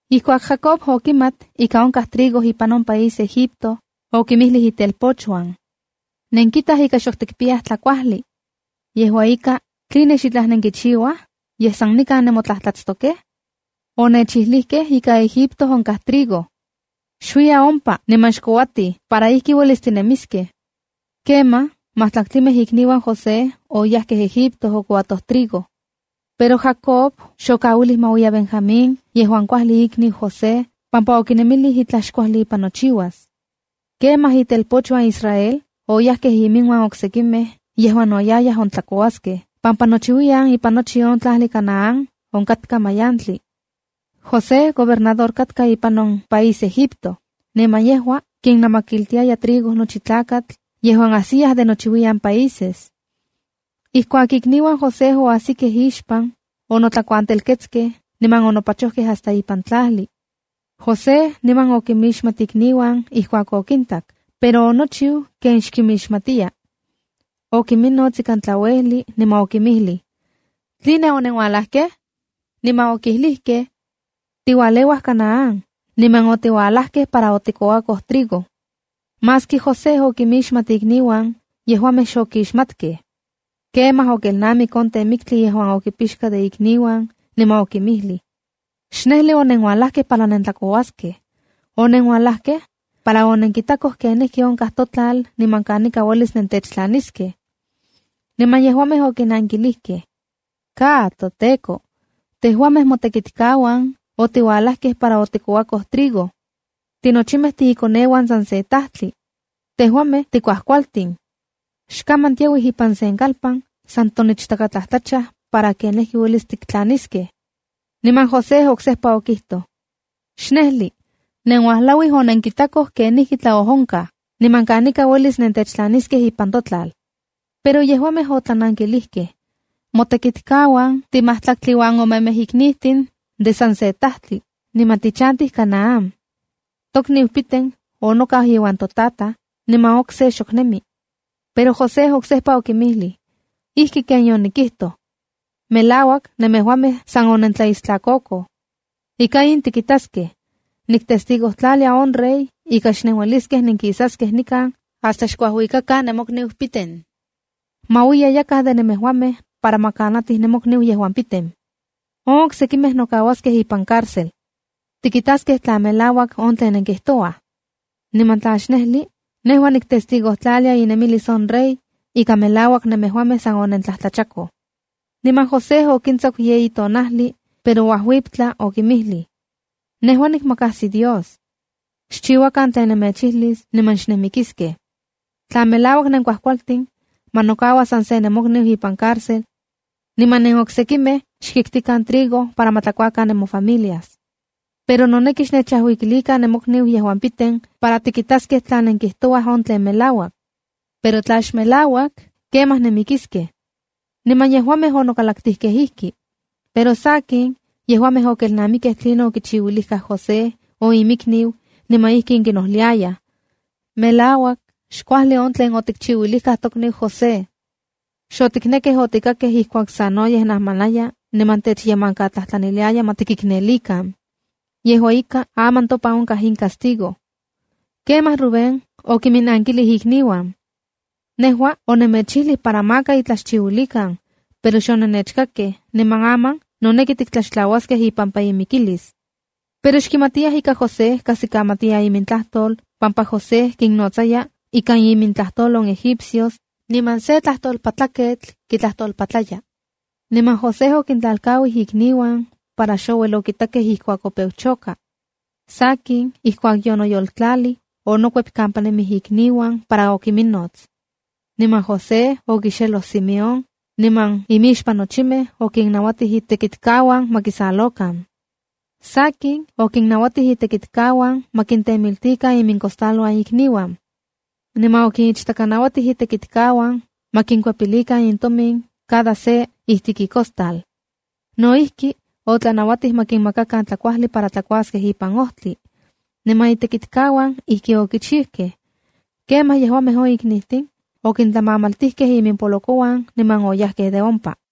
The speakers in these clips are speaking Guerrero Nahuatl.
Ijkuak Jacob okimat ika onkaj trigo ipan on país Egipto, okinmijlij itelpochuan: “Nenkitaj ika xok tikpiyaj tlajkuajli. Yejua ika tej, ¿Tline xitlaj nenkichiuaj, yej san nikan nemotlajtlatstokej? Onechijlikej ika Egipto onkaj trigo. Xuiyan ompa, niman xkouatij para ijki uelis tinemiskej.” Kemaj, majtlaktlimej ikniuan José oyajkej Egipto okouatoj trigo. Pero Jacob xokauilij ma uiya Benjamín yejuan kuajli ikniu José pampa okinemilij uelis itlaj xkuajli ipan nochiuas. Kemaj itelpochuan Israel oyajkej inmiuan oksekimej yejuan no yayaj ontlakouaskej pampa nochiuiyan ipan nochi on tlajli Canaán onkatka mayantli. José gobernador katka ipan on país Egipto, niman yejua kinamakiltiaya trigo nochi tlakatl yejuan ajsiya de nochiuiyan países. Ijkuak ikniuan José oajsikej ixpan, onotlakuantelketskej niman onopachojkej hasta ipan tlajli. José niman okinmixmat ikniuan ijkuak okintak, pero onochiu ken xkimixmatiya. Okinminots ikan tlauejli niman okinmijlij: —¿Tline onenualajkej? Niman okilijkej: —Tiualeuaj Canaán, niman otiualajkej para otikouakoj trigo. Maski José okimixmat ikniuan, yejuamej xokixmatkej. Kemaj okelnamik on temiktli yejuan okipixka de ikniuan, niman okinmijlij: —Xnejli onenualajkej para nentlakouaskej. Onenualajkej para onenkitakoj kenijkionkaj totlal niman kanika uelis nentechtlaniskej. Niman yejuamej okinankilijkej: —¡Ka toteko! Tejuamej motekitkauan otiualajkej para otikouakoj trigo. Tinochimej tiikoneuan san se tajtli. Tejuamej tikuajkualtin. Xkaman tiauij ipan sen kalpan san tonichtatlajtlachaj para kenijki uelis tiktlaniskej. Niman José oksejpa okijtoj: —¡Xnejli! Nenuajlauij onenkitakoj kenijkitlajtlaonkaj, niman kanika uelis nentechtlaniskej ipan totlal. Pero yejuamej otlanankilijkej: —Motekitkauan timajtlaktli uan omemej tiknijtin de san se tajtli, niman tichantij Canaán. Tokniu piten onokau iuan totataj, niman okse xok nemi. Pero José oksejpa okinmijlij: —¡Ijki ken yonikijtoj! Melauak nemejuamej san onentlaistlakokoj. Ika in tikitaskej. Niktestigotlalia on rey ika xnenueliskej nenkisaskej nikan hasta xkuajuikakan nemokniu piten. Ma uiya yakaj de nemejuamej para ma kanatij nemokniu piten. On oksekimej nokauaskej ipan cárcel. Tikitaskej tla melauak on tlen nenkijtouaj. Niman tla xnejli, nejua niktestigotlalia inemilis on rey, ika melauak nemejuamej san onentlajtlachakoj. Niman José okintsaku yeyi tonajli, pero uajuiptla okinmijlij: —Nejua nikmakajsi Dios. Xchiuakan tlen nemechijlis niman xnenmikiskej. Tla melauak nenkuajkualtin, ma nokaua san se nemokniu ipan cárcel. Niman nenoksekimej xkiktikan trigo para ma tlakuakan nemofamilias. Pero noneki xnechajuikilikan nemokniu piten para tikitaskej tla nenkijtouaj on tlen melauak. Pero tla xmelauak, kemaj nenmikiskej. Niman yejuamej onokalaktikej ijki. Pero sakin, yejuamej okelnamikkej tlinon okichiuilikaj José on iminikniu, niman ijkin kinojliayaj: —Melauak xkuajli on tlen otikchiuilijkaj tokniu José. Xotiknekkej otikakkej ijkuak sanoyej najmanaya niman techyemankatlajtlaniliaya ma tikiknelikan. Yejua ika, aman topan onkaj in castigo. Kemaj Rubén okinminakilij ikniuan: —Nejua onemechijlij para maka itlaj xchiuilikan, pero xonenechkakkej, niman aman noneki tiktlaxtlauaskej ipampa imikilis. Pero xkimatiyaj ika José kajsikamatiya imintlajtol pampa José kinnojnotsaya ika imintlajtol on egipcios, niman se tetlajtolpaleuijketl kitlajtolpatlaya. Niman José onkintlalkauij ikniuan para xouel okitakej ijkuak opeu choka. Sakin, ijkuak yonoyoltlalij onokuep kampa nemij ikniuan para okiminnots. Niman José okixeloj Simeón, niman imixpan nochimej okinnauatij itekitkauan ma kisalokan. Sakin, okinnauatij itekitkauan ma kintemiltilikan imincostaluan ikniuan. Niman okinichtakanauatij itekitkauan ma kinkuepilikan intomin cada se ijtik icostal. No ijki, otlanauatij ma kinmakakan tlakuajli para tlakuaskej ipan ojtli. Niman itekitkauan ijki okichijkej. Kemaj yejuamej on iknijtin okintlamamaltijkej iminpolokouan, niman oyajkej de ompa.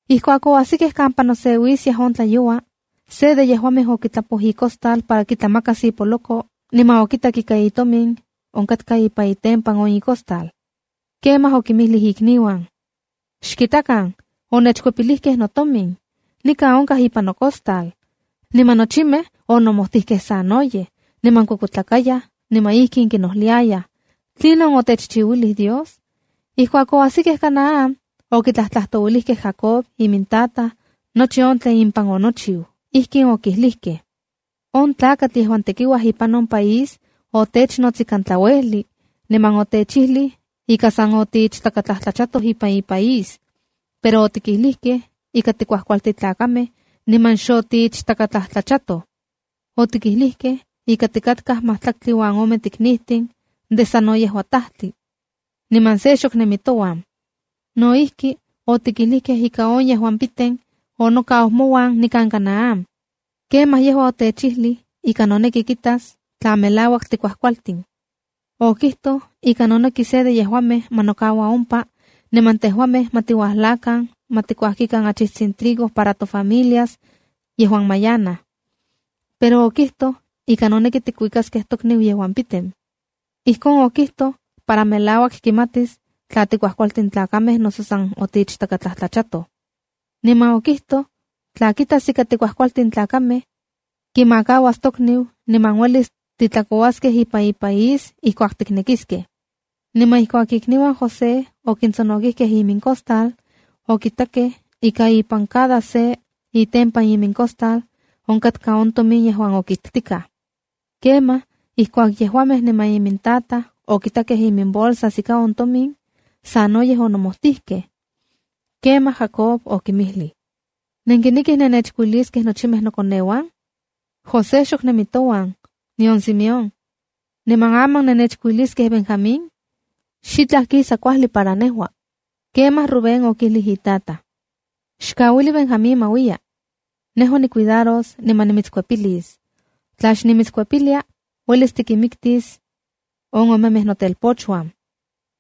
Ijkuak oajsikej kampa noseuiskiaj on tlayoua, se de yejuamej okitlapoj icostal para kitlamakas ipoloko niman okitak ika itomin onkatka ipan itempan on icostal. Kemaj okinmijlij ikniuan: —¡Xkitakan! ¡Onechkuepilijkej notomin! ¡Nikan onkaj ipan nocostal! Niman nochimej onomojtijkej sanoyej, niman kuekuetlakayaj niman ijkin kinojliayaj: —¿Tlinon otechchiuilij Dios? Ijkuak oajsikej Canaán, okitlajtlajtouilijkej Jacob imintataj, nochi on tlen impan onochiu. Ijkin okilijkej: —On tlakatl yejuan tekiuaj ipan on país otechnots ikan tlauejli, niman otechijlij ika san otiichtakatlajtlachatoj ipan ipaís. Pero otikijlijkej ika tikuajkualtin tlakamej niman xotiichtakatlajtlachatoj. Otikijlijkej ika tikatkaj majtlaktli uan ome tiknijtin de sa no yejua tajtli, niman se xok nemi touan. No ijki, otikijlijkej ika on piten onokau mouan nikan Canaán. Kemaj yejua otechijli ika noneki kitas tla melauak tikuajkualtin. Okijtoj ika noneki se de tejuamej ma nokaua ompa, niman tejuamej ma tiuajlakan ma tikuajkikan achijtsin trigo para tofamilias yejuan mayanaj. Pero okijtoj ika noneki tikuikiliskej tokniu piten. Ijkon okijtoj para melauak kimatis tla tikuajkualtin tlakamej noso san otiichtakatlajtlachatoj. Niman okijtoj tla kitas ika tikuajualtin tlakamej, kimakauas tokniu niman uelis titlakouaskej ipan ipaís ijkuak tiknekiskej. Niman ijkuak ikniuan José okintsonokikej imincostal, okitakej ika ipan cada se itempan imincostal onkatka on tomin yejuan okiktikaj. Kemaj ijkuak yejuamej niman imintataj okitakej iminbolsas ika on tomin, sanoyej onomojtijkej. Kemaj Jacob okinmijlij: —¿Nenkinekij nenechkuiliskej nochimej nokoneuan? José xok nemi touan, nion Simeón. Niman aman nennechkuiliskej Benjamín. Xitlaj kisa kuajli para nejua. Kemaj Rubén okijlij itataj: —Xkauili Benjamín ma uiya. Nejua nicuidaros niman nimitskuepilis. Tla xnimitskuepilia, uelis tikinmiktis on omemej notelpochuan.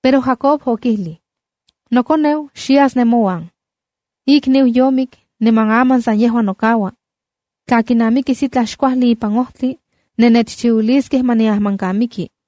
Pero Jacob okijlij: —Nokoneu xyas nemouan. Ikniu yomik niman aman sa yejua nokaua. Tla kinamikis itlaj xkuajli ipan ojtli, nennechchiuiliskej ma niajmankamiki.